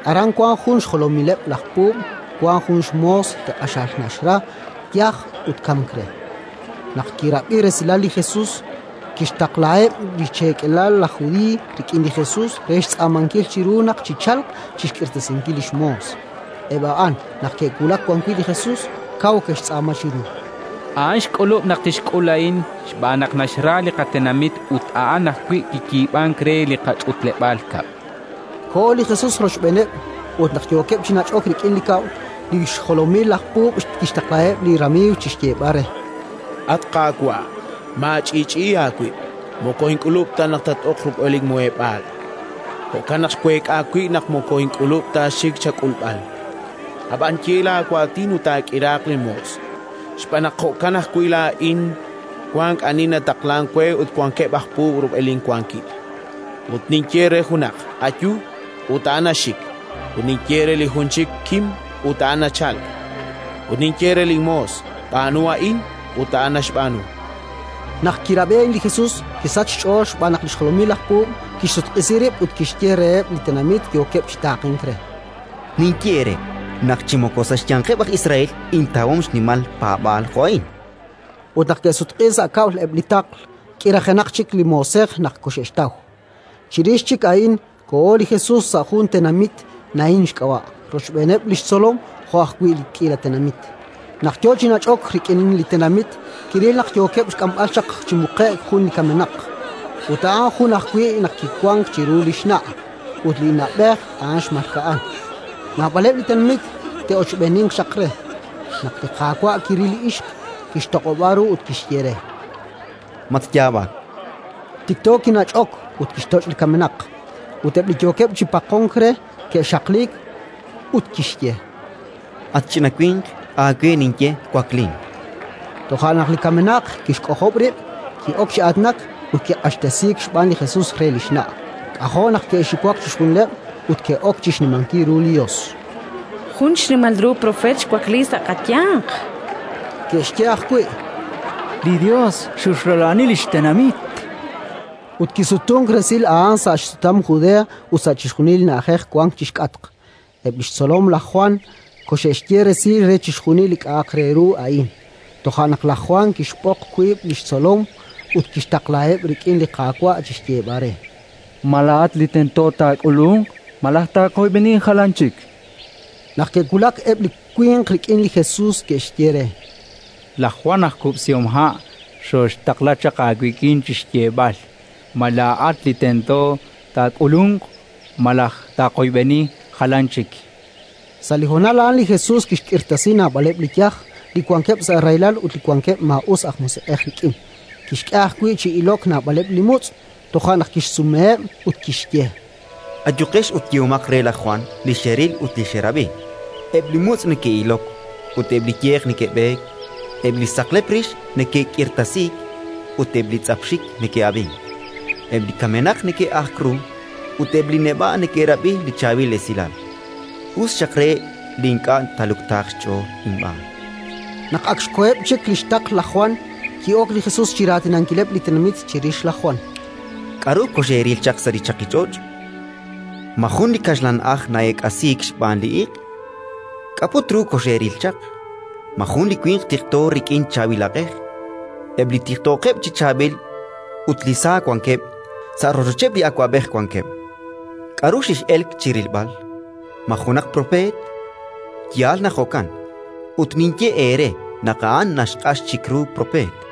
Aran wank jun xjolomileb' laj puub' wank jun xmoos li q'axal naxra, yaj ut kamk re. Naq kirab'i resilal li Jesus, kixtaqlaheb' li xcheekelal laj Judiiy rik'in li Jesus re xtz'aamankil chiru naq chichalq chi xk'irtasinkil li xmoos. Eb' a'an, naq ke'wulak wan wi' li Jesus, kaw ke'xtz'aama chiru: —A'an xk'ulub' naq tixk'ul a'in -chankeb'- xb'aan naq naxra li qatenamit, ut a'an ajwi' kiyiib'ank re li qach'utleb'aal kab'l. Koho li Jesus rochb'eeneb' ut, naq yookeb' chi nach'ok rik'in li kab'l, li xjolomileb' laj puub' kixtaqlaheb' li ramiiw chi xyeeb'al re: “At Qaawa', maach'i'ch'i'i aawib': moko ink'ulub' ta naq tat-ok rub'el linmuheb'aal. Jo'kan naq xweek'a wib' naq moko ink'ulub' ta xik chak'ulb'al. Ab'an ye laawaatin ut taak'iraaq linmoos. Xb'aan naq jo'kan ajwi' laa'in wank ani nataqlank we ut wankeb' aj puub' rub'el inwankil, ut ninye re junaq: «Ayu», ut a'an naxik; ut ninye re li jun chik: «Kim», ut a'an nachalk; ut ninye re linmoos: «B'aanu a'in», ut a'an naxb'aanu”. Naq kirab'i a'in li Jesus, kisachk xch'ool xb'aan li xjolomileb' laj puub'; kixsutq'isi rib' ut kixye reheb' li tenamit yookeb' chi taaqenk re: —Ninye eere naq chi moko sa' xyanqeb' laj Israel intawom xnimal paab'aal jo' a'in. Ut naq ke'sutq'iik sa' kab'l eb' li taql, k'irajenaq chik li moosej naq koxe'xtaw. Chirix chik a'in koho li Jesus sa' jun tenamit, Naín xk'ab'a', rochb'eeneb' li xtzolom jo' ajwi' li k'iila tenamit. Naq yo chi nach'ok rik'in li tenamit, kiril naq yookeb' xk'amb'al chaq chi muqe'k jun li kamenaq; ut a'an jun ajwi' naq kiwank chiru li xna' ut li na'b'ej a'an xmalka'an. Naab'aleb' li tenamit te'ochb'eeninq chaq re. Naq li Qaawa' kiril li ixq, kixtoq'ob'a ru ut kixye re: —Matyaab'ak. Tikto kinach'ok ut kixtoch' li kamenaq, ut eb' li yookeb' chi paqonk re ke'xaqliik. Ut kixye: —At ch'ina winq, aawe ninye: Waklin! Toja' naq li kamenaq kixk'ojob' rib', ki'ok chi aatinak ut kiq'axtesiik xb'aan li Jesus re li xna'. K'ajo' naq ke'xiwak chixjunileb' ut ke'ok chi xnimankil ru li Yos: —Jun xnimal ru propeet xwakliik sa' qayanq. Ke'xye ajwi': —Li Yos xolrula'ani li xtenamit. Ut kisutunk resil a'an sa' xsutam Judea ut sa' chixjunil li na'ajej wank chi xk'atq. Eb' li xtzolom laj Jwan koxe'xye resil re chixjunil li k'a'aq re ru a'in. Toja' naq laj Jwan kixb'oq wiib' li xtzolom ut kixtaqlaheb' rik'in li Qaawa' chi xyeeb'al re: “Ma laa'at li tento taak'ulunq, malaj taaqoyb'eni jalan chik?”. Naq ke'wulak eb' li winq rik'in li Jesus, ke'xye re: —Laj Jwan aj kub'sihomha' xooxtaqla chaq aawik'in chi xyeeb'al: «Ma laa'at li tento taak'ulunq, malaj taaqoyb'eni jalan chik?». Sa' li honal a'an li Jesus kixk'irtasi naab'aleb' li yaj, li wankeb' sa' rahilal ut li wankeb' maa'us aj musiq'ej rik'in; kixk'e ajwi' chi ilok naab'aleb' li mutz'. Toja' naq kixsumeheb' ut kixye: —Ayuqex ut yehomaq re laj Jwan li xeril ut xerab'i. Eb' li mutz' neke'ilok ut eb' li yeq neke'b'eek, eb' li saqlep rix neke'k'irtasiik ut eb' li tz'ap xik neke'ab'ink, eb' li kamenaq neke'ajk ru ut eb' li neb'a' neke'rab'i li Chaab'il Esilal. Us xaq re li ink'a' taaluktaaq xch'ool inb'aan. Naq ak xkoheb' chik li xtaql laj Jwan, ki'ok li Jesus chi raatinankileb' li tenamit chirix laj Jwan: “K'aru koxeeril chaq sa' li chaqich'och'? Ma jun li kaxlan'aj na'eek'asiik xb'aan li iq'? K'a' put ru koxeeril chaq? Ma jun li winq tiqto rik'in chaab'il aq'ej? Eb' li tiqtookeb' chi chaab'il ut li sa wankeb', sa' rochocheb' li awab'ej wankeb'. K'aru kex'elk chi rilb'al? Ma junaq propeet? Yaal naq jo'kan; ut ninye eere naq a'an naxq'ax chik ru propeet.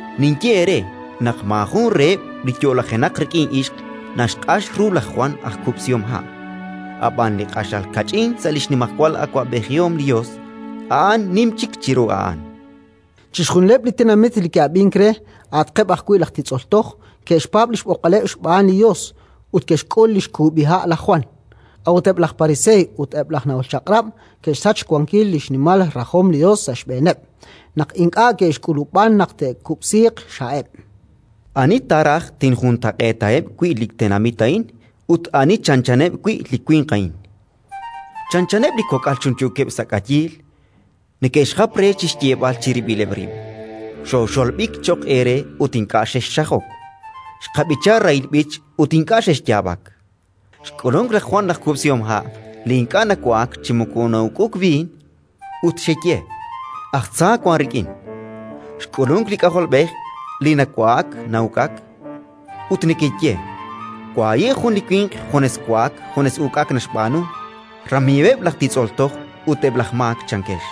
Ninye eere naq maajun reheb' li yo'lajenaq rik'in ixq naxq'ax ru laj Jwan aj kub'sihomha'. Ab'an li q'axal kach'in sa' li xnimajwal awab'ejihom li Yos, a'an nim chik chiru a'an. “Chixjunileb' li tenamit li ke'ab'ink re, a'atqeb' ajwi' laj titz'ol toj, ke'xpaab' li xb'oqb'aleb' xb'aan li Yos ut ke'xk'ul li xkub'iha' laj Jwan. A'ut eb' laj pariseey ut eb' laj nahol Chaq'rab' ke'xsach xwankil li xnimal rajom li Yos sa' xb'eeneb', naq ink'a' ke'xk'ulub'an naq te'kub'siiq xha'eb'. “Ani ta raj tinjuntaq'eetaheb' wi' li tenamit a'in ut ani chanchaneb' wi' li winq a'in? Chanchaneb' li kok'al chunchuukeb' sa' k'ayiil, neke'xjap re chi xyeeb'al chirib'ileb' rib': «Xooxolb'ik cho'q eere ut ink'a' xexxajok; xqab'icha rahil b'ich ut ink'a' xexyaab'ak». Xk'ulunk laj Jwan aj kub'sihomha' li ink'a' nawa'ak chi moko na'uk'uk b'iin, ut xeye: «Aj tza wank rik'in». Xk'ulunk li K'ajolb'ej li nawa'ak na'uk'ak, ut nekeye: «Wahi' jun li winq junes wa'ak, junes uk'ak naxb'aanu, ramiiweb' laj titz'ol toj ut eb' laj maak», chankex.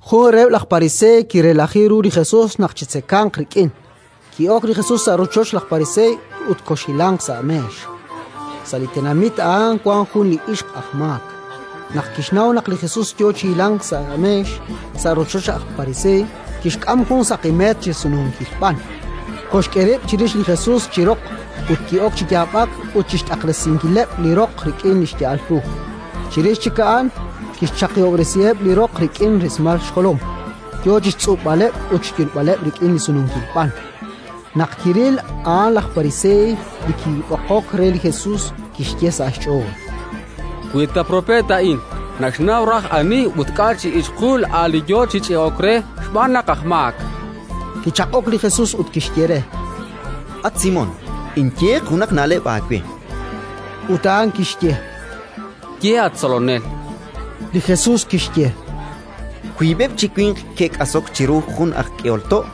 Jun reheb' laj pariseey kirelaji ru li Jesus naq chitzekanq rik'in. Ki'ok li Jesus sa' rochoch laj pariseey ut koxhilanq sa' meex. Sa' li tenamit a'an wank jun li ixq aj maak. Naq kixnaw naq li Jesus yo chi hilank sa' meex, sa' rochoch laj pariseey, kixk'am jun saqi meet chi sununkil b'an, koxk'e rib' chirix li Jesus, chi roq, ut ki'ok chi yaab'ak ut chi xt'aqresinkileb' li roq rik'in li xya'al ru. Chirix chik a'an kixchaqihob'resiheb' li roq rik'in rismal xjolom, yo chi xtz'ub'aleb' ut xyulb'aleb' rik'in li sununkil b'an. Naq kiril a'an laj pariseey li kib'oqok re li Jesus, kixye sa' xch'ool: “Wi ta propeet a'in, naxnaw raj ani ut k'a' chi ixqul a'an li yo chi ch'e'ok re, xb'aan naq aj maak”. Kichaq'ok li Jesus ut kixye re: —At Simón, inyeeq junaq na'leb' aawe. Ut a'an kixye: —Ye, at Tzolonel. Li Jesus kixye: —Wiib'eb' chi winq ke'k'asok chiru jun aj k'ehol to':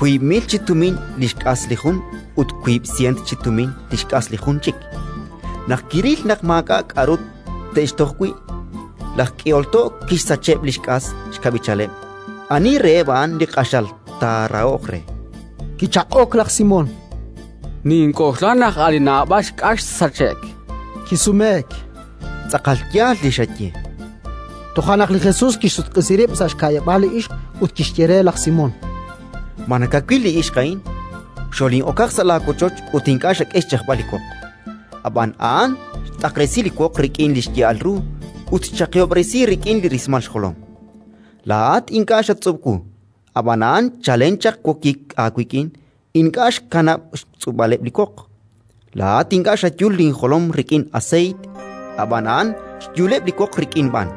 wiib' mil chi tumin li xk'as li jun ut wiib' sieent chi tumin li xk'as li jun chik. Naq kiril naq maak'a' k'aru te'xtoj wi', laj k'ehol to' kixsacheb' li xk'as xkab'ichaleb'. Ani reheb' a'an li q'axal taarahoq re? Kichaq'ok laj Simón: —Nink'oxla naq a' li naab'al xk'as xsache'k, chan. Kisumeek: —Tz'aqal yaal li xaye. Toja' naq li Jesus kixsutq'isi rib' sa' xka'yab'aal li ixq ut kixye re laj Simón: —Ma nakawil li ixq a'in? Xolin'okaq sa' laawochoch ut ink'a' xak'e xch'ajb'al li woq. Ab'an a'an xt'aqresi li woq rik'in li xya'al ru ut xchaqihob'resi rik'in li rismal xjolom. Laa'at ink'a' xatz'ub' wu; ab'an a'an chalen chaq wokik aawik'in ink'a' xkanab' xtz'ub'aleb' li woq. Laa'at ink'a' xayul linjolom rik'in aseeyt; ab'an a'an xyuleb' li woq rik'in b'an.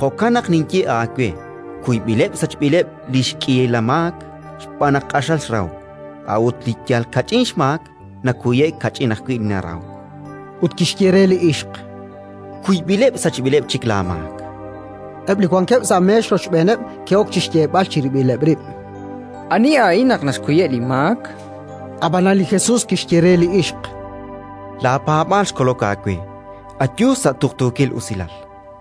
Jo'kan naq ninye aawe: kuyb'ileb' sachb'ileb' li xk'iila maak xb'aan naq q'axal xrahok. A'ut li yal kach'in xmaak nakuye'k, kach'in ajwi' narahok. Ut kixye re li ixq: —Kuyb'ileb' sachb'ileb' chik laamaak. Eb' li wankeb' sa' meex rochb'een ke'ok chi xyeeb'al chirib'ileb' rib': —Ani a'in naq naxkuyeb' li maak? Ab'anan li Jesus kixye re li ixq: —Laapaab'aal xkolok aawe; ayu sa' tuqtuukil usilal.